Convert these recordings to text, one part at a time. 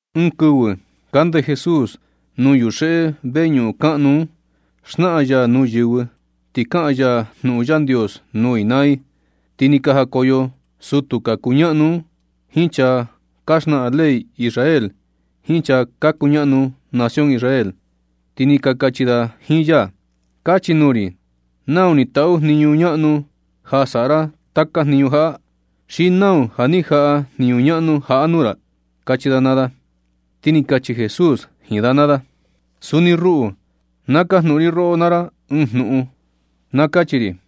Ɨɨn kɨvɨ kande Jesús nuu yuxeꞌe veñuꞌun kaꞌnu un xnaꞌan ya nuu yɨvɨ, ti kaꞌan ya jnuꞌun Yandios nuu i naa i, ti ni ka jakoyo sutu ka kuñaꞌnu un jiin chaa ka xnaꞌan ley Israel jiin chaa ka kuñaꞌnu nación Israel, ti ni ka kachi da jiin ya: ―Kachi nuu ri, ¿nau ni taꞌu jniñu ñaꞌnu ja saꞌa ra taka jniñu jaꞌa? ¿Xi nau ja ni jaꞌa jniñu ñaꞌnu jaꞌa nuu ra? ―kachi da naa da. Ti ni kachi Jesús jiin da naa da: ―Suni ruꞌu, na kajnuꞌun ri roꞌo naa ra ɨɨn jnuꞌun. Na kachi ri,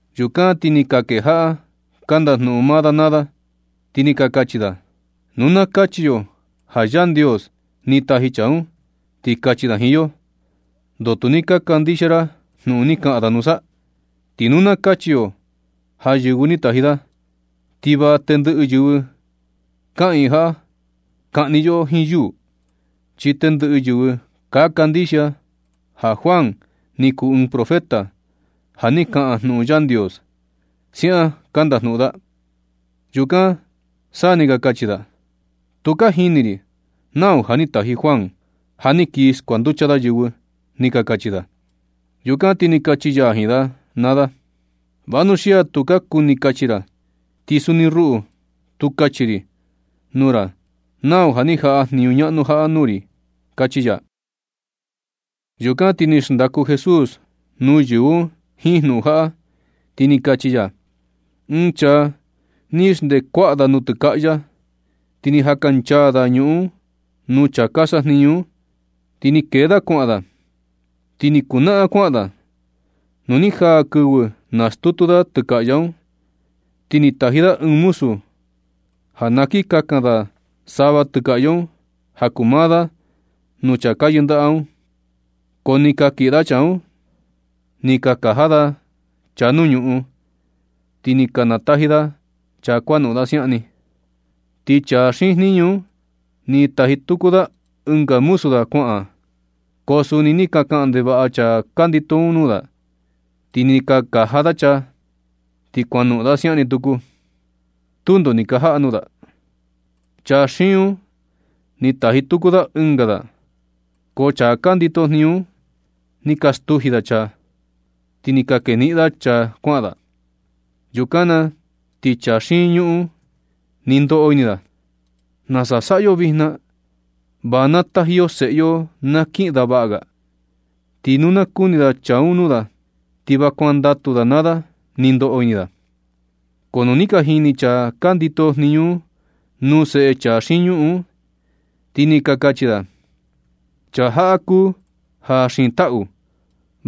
Yukan ti ni ka kejaꞌa ka ndajnuꞌun maa da naa da, ti ni ka kachi da: ―Nu na kachi yo ja Yandios ni taji chaa un, ti kachi da jiin yo: “¿Ndoo tu ni ka kandixia ra jnuꞌun ni kaꞌan da nusa?” Ti nu na kachi yo ja yɨvɨ ni taji da, ti va tendɨꞌɨ yɨvɨ kaꞌiin jaꞌa kaꞌni yoꞌo jiin yuu, chi tendɨꞌɨ yɨvɨ ka kandixia ja Juan ni kuu ɨɨn profeta, ja ni kaꞌan jnuꞌun Yandios ―siaꞌan ka ndajnuꞌun da. Yukan sa ni ka kachi da: ―Tu ka jini ri nau ja ni taji Juan, ja ni kii skuanducha da yɨvɨ ―ni ka kachi da. Yukan na ti ni kachi ya jiin da naa da: ―Vanuxia tu ka kuni kachi ra, ti suni ruꞌu tu kachi ri nuu ra nau ja ni jaꞌa jniñu ñaꞌnu jaꞌa nuu ri ―kachi ya. Yukan ti ni xndaku Jesús nuu yɨvɨ un jiin jnuꞌun jaꞌa, ti ni kachi ya: ―Ɨɨn chaa ni xndee kuaꞌa da nutɨkaꞌya, ti ni jakanchaa da ñuꞌun un nuu chaa ka sajniñu un, ti ni kee da kuaꞌan da, ti ni kunaꞌan kuaꞌan da. Nu ni jaa kɨvɨ nastutu da tɨkaꞌya un, ti ni taji da ɨɨn muzu ja na kin kakan da sava tɨkaꞌya un ja kuu maa da nuu chaa ka yɨndaꞌa un. Ko ni ka kiꞌin da chaa un, ni ka kaja da chaa nuu ñuꞌun, ti ni ka nataji da chaa kuanoꞌon da siaꞌan ni. Ti chaa xiin jniñu un, ni taji tuku da ɨnga muzu da kuaꞌan, ko suni ni ka kaꞌan ndevaꞌa chaa ka ndito un nuu da, ni ka kaja da chaa, ti kuanoꞌon da siaꞌan ni tuku. Tundo ni ka jaꞌa da nuu da. Chaa xiin un, ni taji tuku da ɨnga da, ko chaa ka ndito jniñu un ni ka stuji da chaa, ti ni ka keniꞌin da chaa kuaꞌan da. Yukan na ti chaa xiin ñuꞌun un, ni ndoꞌo ini da: “¿Nasa saꞌa yo vijna na? Va na taji yo seꞌe yo na kiꞌin da vaꞌa ga, ti nu na kuni chaa un nuu da, ti va kuandatu da naa da”, ni ndoꞌo ini da. Ko nu ni ka jini chaa ka ndito jniñu un nuu seꞌe chaa xiin ñuꞌun un, ti ni ka kachi da: “Chaa jaꞌa kuu ja xiin taꞌu.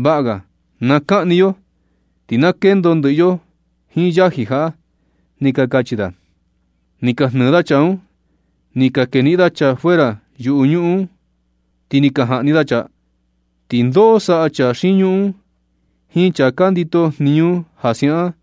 Vaꞌa ga na kaꞌni yo, ti na kendo ndɨꞌɨ yo jiin yaji jaꞌa”, ni ka kachi da. Ni ka jnɨɨ da chaa un, ni ka keniꞌin da chaa fuera yuꞌu ñuꞌun un, ti ni ka jaꞌni da chaa. ¿Ti ndoo saꞌa chaa xiin ñuꞌun un jiin chaa ka ndito jniñu ja siaꞌan?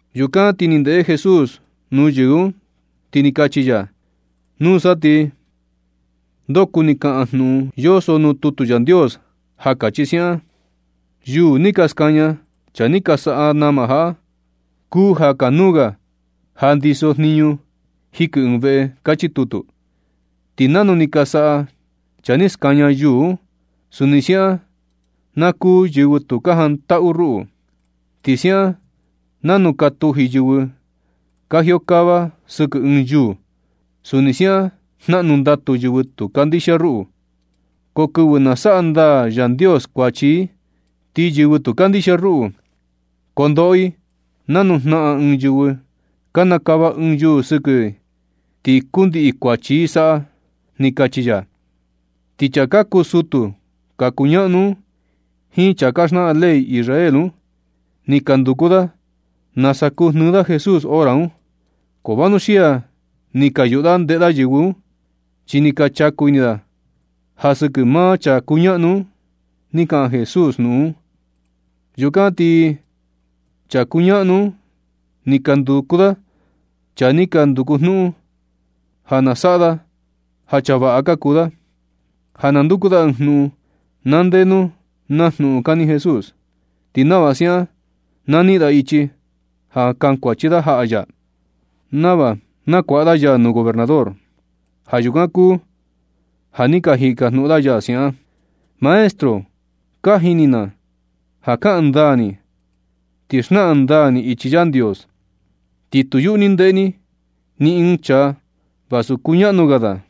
Yukan ti ni ndeꞌe Jesús nuu yɨvɨ un, ti ni kachi ya: ―Nusa ti ¿ndoo kuni kaꞌan jnuꞌun yoso nuu tutu Yandios ja kachi siaꞌan? Yuū ni ka skaña chaa ni ka saꞌa nama jaꞌa, kuu ja kanuu ga ja ndiso jniñu jikɨ ɨɨn veꞌe. Kachi tutu. Ti nanu ni ka saꞌa chaa ni skaña yuū un, suni siaꞌan na kuu yɨvɨ tu ka jantaꞌu ruꞌu. Ti siaꞌan nanu ka tuji yɨvɨ ka jiokava sɨkɨ ɨɨn yuū, suni siaꞌan jnaꞌnu ndatu yɨvɨ tu kandixia ruꞌu. Ko kɨvɨ na saꞌa ndaa Yandios kuachi i, ti yɨvɨ tu ni kandixia ruꞌu, koo ndoꞌo i nanu jnaꞌan ɨɨn yɨvɨ kanakava ɨɨn yuū sɨkɨ i ti kundiꞌi kukuachi i saꞌa ―ni kachi ya. Ti chaa ka kuu sutu ka kuñaꞌnu un jiin chaa ka xnaꞌan ley Israel un, ni ka nduku da nasa kuu jnɨɨ da Jesús hora un. Ko vanuxia ni ka yuꞌu da ndeꞌe da yɨvɨ un. Chi ni ka chaku ini da ja sɨkɨ maa chaa ka kuñaꞌnu un, ni kaꞌan Jesús jnuꞌun un. Yukan ti chaa ka kuñaꞌnu un ni ka nduku da chaa ni ka nduku jnuꞌun, ja na saꞌa da ja chaa vaꞌa ka kuu da, ja na nduku da ɨɨn jnuꞌun, na ndenu naa jnuꞌun kani Jesús, ti nava siaꞌan ti na niꞌin da ichi ja kankuachi da jaꞌa ya, nava nakuaꞌa da ya nuu gobernador. Ja yukan kuu ja ni ka jikajnuꞌun da ya siaꞌan: ―Maestro, ka jini na ja kaꞌan ndaa ni, ti xnaꞌan ndaa ni ichi Yandios, ti tu yuꞌu ni ndeꞌe ni ni ɨɨn chaa vasu kuñaꞌnu ga da.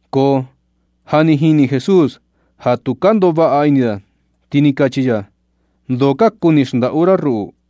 Ko ja jini Jesús ja tu ka ndoꞌo vaꞌa ini da, ti ni kachi ya: ―¿Ndoo ka kuni xndaꞌu ra ruꞌu?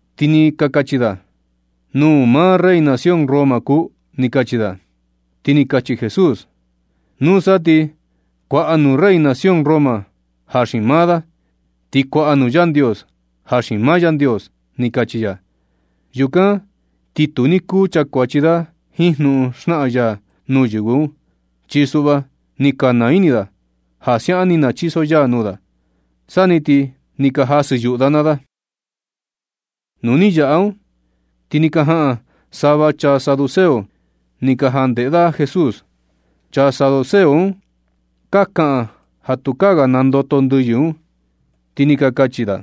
Ti ni ka kachi da: ―Nūū maa rey nación Roma kuu ―ni ka kachi da. Yukan ti ni kachi Jesús: ―Nusa ti kuaꞌa nuu rey nación Roma ja xiin maa da, ti kuaꞌa nuu Yandios ja xiin maa Yandios ―ni kachi ya. Yukan ti tu ni kuu chakuachi da jiin jnuꞌun xnaꞌan ya nuu yɨvɨ un. Chi suꞌva ni ka naa ini da ja siaꞌan ni nachiso ya nuu da, sa ni ti ni ka jasɨ yuꞌu da naa da. Nu ni yaꞌa un, ti ni ka jaꞌan sava chaa saduceo ni ka jandeꞌe da Jesús. Chaa saduceo un ka kaꞌan ja tukaa ga ka nandoto ndɨyɨ un, ti ni ka kachi da: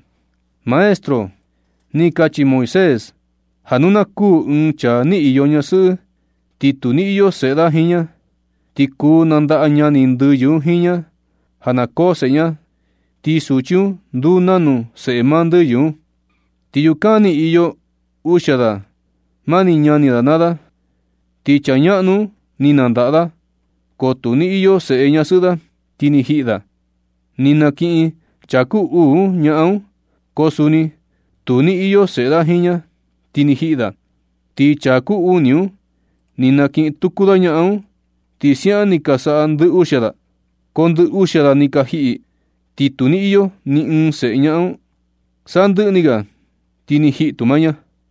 ―Maestro, ni kachi Moisés ja nu na kuū ɨɨn chaa ni iyo ñasɨꞌɨ, ti tu ni iyo seꞌe da jiin ña, ti kuu nandaꞌa ñani ndɨyɨ un jiin ña ja na koo seꞌe ña, ti suchi un nduu nanu seꞌe maa ndɨyɨ un. Ti yukan ni iyo uxia da mani ñani da naa da. Ti chaa ñaꞌnu un ni nandaꞌa da, ko tu ni iyo seꞌe ñasɨꞌɨ da, ti ni jiꞌi da. Ni nakiꞌin chaa kuu uu un ñaꞌan un, ko suni tu ni iyo seꞌe da jiin ña, ti ni jiꞌi da. Ti chaa kuu uni un ni nakiꞌin tuku da ñaꞌan un, ti siaꞌan ni ka saꞌa ndɨ uxia da, ko ndɨ uxia da ni ka jiꞌi, ti tu ni iyo ni ɨɨn seꞌe ñaꞌan un. Sandɨꞌɨ ni ga ti ni jiꞌi tu maa ña.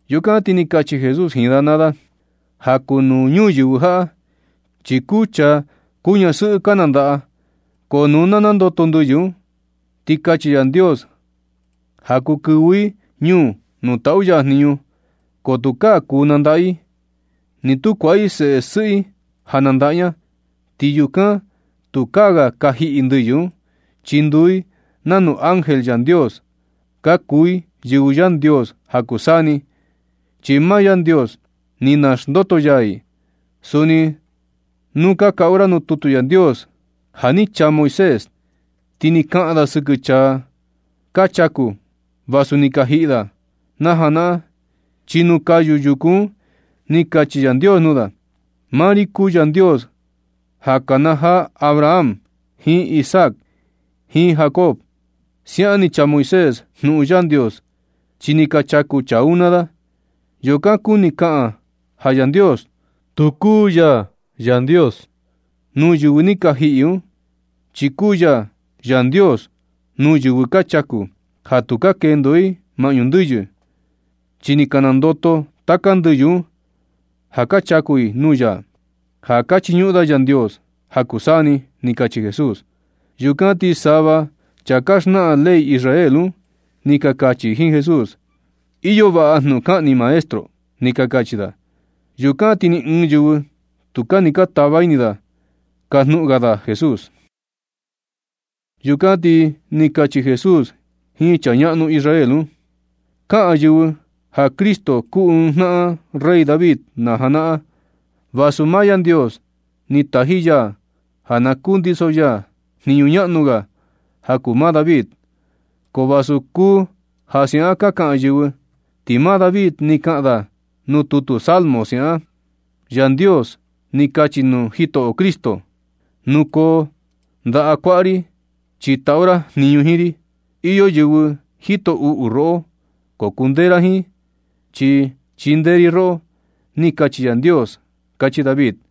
Yukan ti ni kachi Jesús jiin da naa da: ―Ja kuu nuu ñuyɨvɨ jaꞌa, chi kuu chaa, kuu ñasɨꞌɨ ka nandaꞌa. Ko nu na nandoto ndɨyɨ un, ti kachi Yandios ja kuu kɨvɨ i ñuu nuu taꞌu ya jniñu, ko tukaa kuu nandaꞌa i ni tu kuaꞌa i seꞌe sɨꞌɨ i ja nandaꞌa ña. Ti yukan tukaa ga ka jiꞌi ndɨyɨ un, chi nduu i nanu ángel Yandios. Ka kuu i yɨvɨ Yandios ja kuu saa ni, chi maa Yandios ni naxndoto ya i. Suni nu ka kaꞌu ra nuu tutu Yandios ja ni chaa Moisés, ti ni kaꞌan da sɨkɨ chaa ka chaku vasu ja ni ka jiꞌi da na janaꞌan. Chi nuu kayu yukū un, ni kachi Yandios nuu da: “Maa ri kuu Yandios ja ka kanajaa Abraham jiin Isaac jiin Jacob.” Siaꞌan ni chaa Moisés jnuꞌun Yandios, chi ni ka chaku chaa un naa da. Yukan kuni kaꞌan ja Yandios tu kuu ya Yandios nuu yɨvɨ ni ka jiꞌi un, chi kuu ya Yandios nuu yɨvɨ ka chaku, ja tu ka kendo i maꞌñu ndɨyɨ, chi ni ka nandoto taka ndɨyɨ un ja ka chaku i nuu ya, ja ka chiñuꞌun da Yandios ja kuu saa ni ―ni kachi Jesús. Yukan ti sava chaa ka xnaꞌan ley Israel un, ni ka kachi jiin Jesús: ―Iyo vaꞌa jnuꞌun kaꞌan ni, maestro ―ni ka kachi da. Yukan ti ni ɨɨn yɨvɨ, tukaa ni ka tava ini da kajnuꞌun ga da Jesús. Yukan ti ni kachi Jesús jiin chaa ñaꞌnu Israel un: ―Kaꞌan yɨvɨ ja Cristo kuu ɨɨn jnaꞌan rey David na janaꞌan, vasu maa Yandios ni taji ya ja na kundiso ya ɨɨn jniñu ñaꞌnu ga ja kuu maa David. Ko vasu kuu ja siaꞌan ka kaꞌan yɨvɨ. Ti maa David ni kaꞌan da nuu tutu Salmo siaꞌan: Yandios ni kachi nuu Jitoꞌo Cristo: “Nukoo ndaꞌa kuaꞌa ri, chi taꞌu ra jniñu jiin ri. Iyo yɨvɨ jito uꞌu roꞌo, ko kundee ra jiin, chi chindee ri roꞌo.” Ni kachi Yandios, kachi David.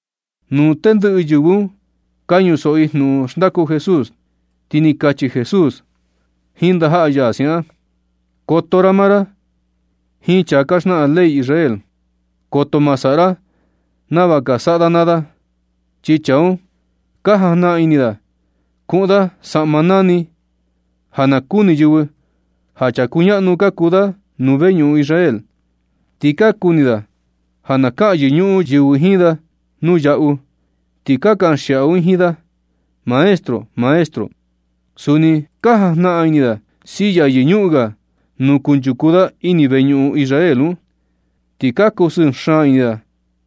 Nu tendɨꞌɨ yɨvɨ un ka ñusoꞌo i jnuꞌun xndaku Jesús, ti ni kachi Jesús jiin ndajaꞌa ya siaꞌan: ―Koto maa ra naa ra jiin chaa ka xnaꞌan ley Israel. Koto ma saꞌa ra nava ka saꞌa da naa da. Chi chaa un ka jajnaꞌan ini da kuꞌun da saꞌma nani, ja na kuni yɨvɨ ja chaa kuñaꞌnu ka kuu da nuu veñuꞌun Israel. Ti ka kuni da ja na kaꞌan yɨñuꞌun yɨvɨ jiin da nuu yaꞌu, ti na kaꞌan xiaꞌu i jiin da, “Maestro, maestro.” Suni ka jajnaꞌan ini da silla yɨñuꞌun ga nuu kunchuku da ini veñuꞌun Israel un. Ti ka kusɨɨ xaan ini da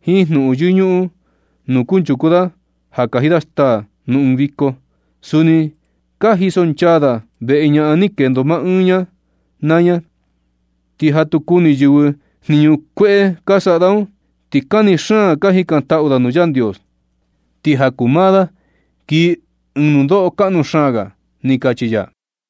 jiin jnuꞌun yɨñuꞌun nuu kunchuku da kaji da staa nuu ɨɨn viko. Suni ka jisonchaa da veꞌe ñaꞌan ni kendo maa ɨɨn ña naa ña, ti ja tu kuni yɨvɨ jniñu kueꞌe ka saꞌa da un, ti kani xaan ka jikantaꞌu da nuu Yandios. Ti ja kuu maa da kii ɨɨn nundoꞌo kaꞌnu xaan ga ―ni kachi ya.